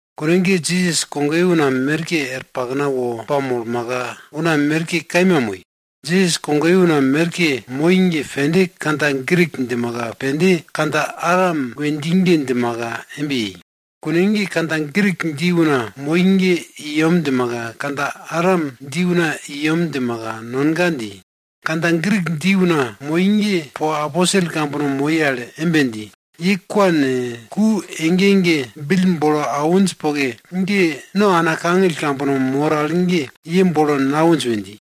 Kune ge Jisas kogoye una merke er pakna wo pamolmaka, una merke kaima moi. Jisas kogoye una merke moi ge pende kandja Grik djimaka, pende kandja Aram we dji ge djimaka embe yei. Kune ge kandja Grik dji una moi ge i yem djimaka, kandja Aram dji una i yem djimaka nonga dji. Kandja Grik dji una moi ge po aposel kambono moi al embe dji, ye kwa ne, ku ege ege bill bolo awinj poke ge, no ana kangill kambono mor al ge ye bill bolo nawinj we dji.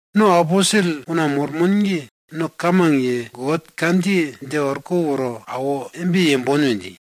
Nono aposel una mormon ge, no kamang ye, God kandjiye dje orko woro awo embe yembon we dji.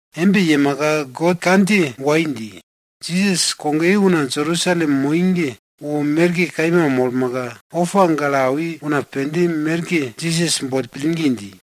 Embe yemaka God kandjiye wai dji. Jisas kogoye una Jerusalem moi ge wo merke kaima molmaka, opa gale awi una pende merke Jisas boll pillgi dji.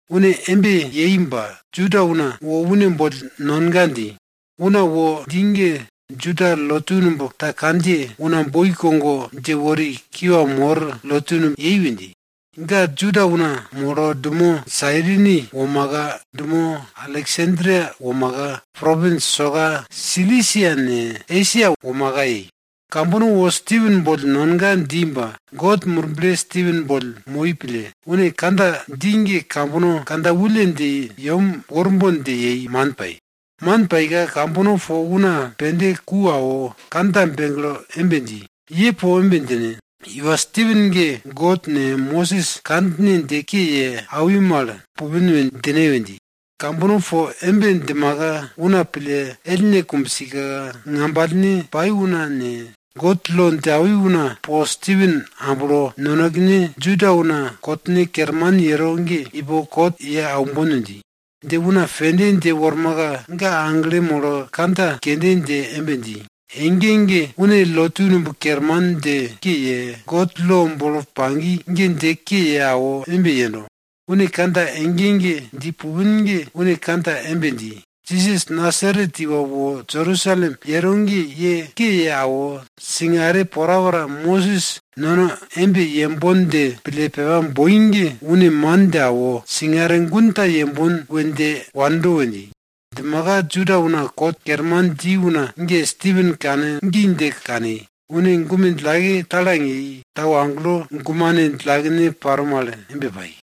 Une embe yei ba, Juda una wo une boll nonga dji. Una wo dji ge Juda lotu numb ta kandjiye Una boi kogo dje wori kiwa mor lotu numb yei we dji. Ga Juda una molo dumo Sarini womaka, dumo Aleksandria womaka, propins soka Silisia ne, Esia womaka yei. Kambono wo Stipen boll nonga dji ba, God Murble Stipen boll moi pille, une kandja dji ge, kambono kandja wulle dje yem worbon dje yei, man pai. Man paika, kambono po una pende ku awo kandja begle embe dji, ye po embe djine, iwa Stipen ge God ne, Mosis kandjine dje ke ye awi mal pupin we djine we dji. Kambono po embe djimaka una pille ellne kumbsika, ngambalne pai una ne, God lo dje awi una po Stipen amblo, nonekene Juda una kot kerman paro al ge ipo kot ye aumbon we dji. Dje una pende dje wormaka, ga aglo molo kandja kende dje embe dji, ege ege une lotu numb kerman dje ke ye, God lo bolo pagi ge dje ke ye awo embe yendo. Une kandja ege ege dji pupin ge une kandja embe dji, Jisas Nasaret iwa wo Jerusalem yero ge ye ke ye awo, singare porapora Mosis nono embe yembon dje pille pepa boi ge, une man dje awo, singare gun ta yembon we dje wando we dji. Djimaka Juda una kot kerman dji una ge, Stipen kane gi dje kani, une gume djillake talang yei tau agelo gumane djillakene paro mal embe pai.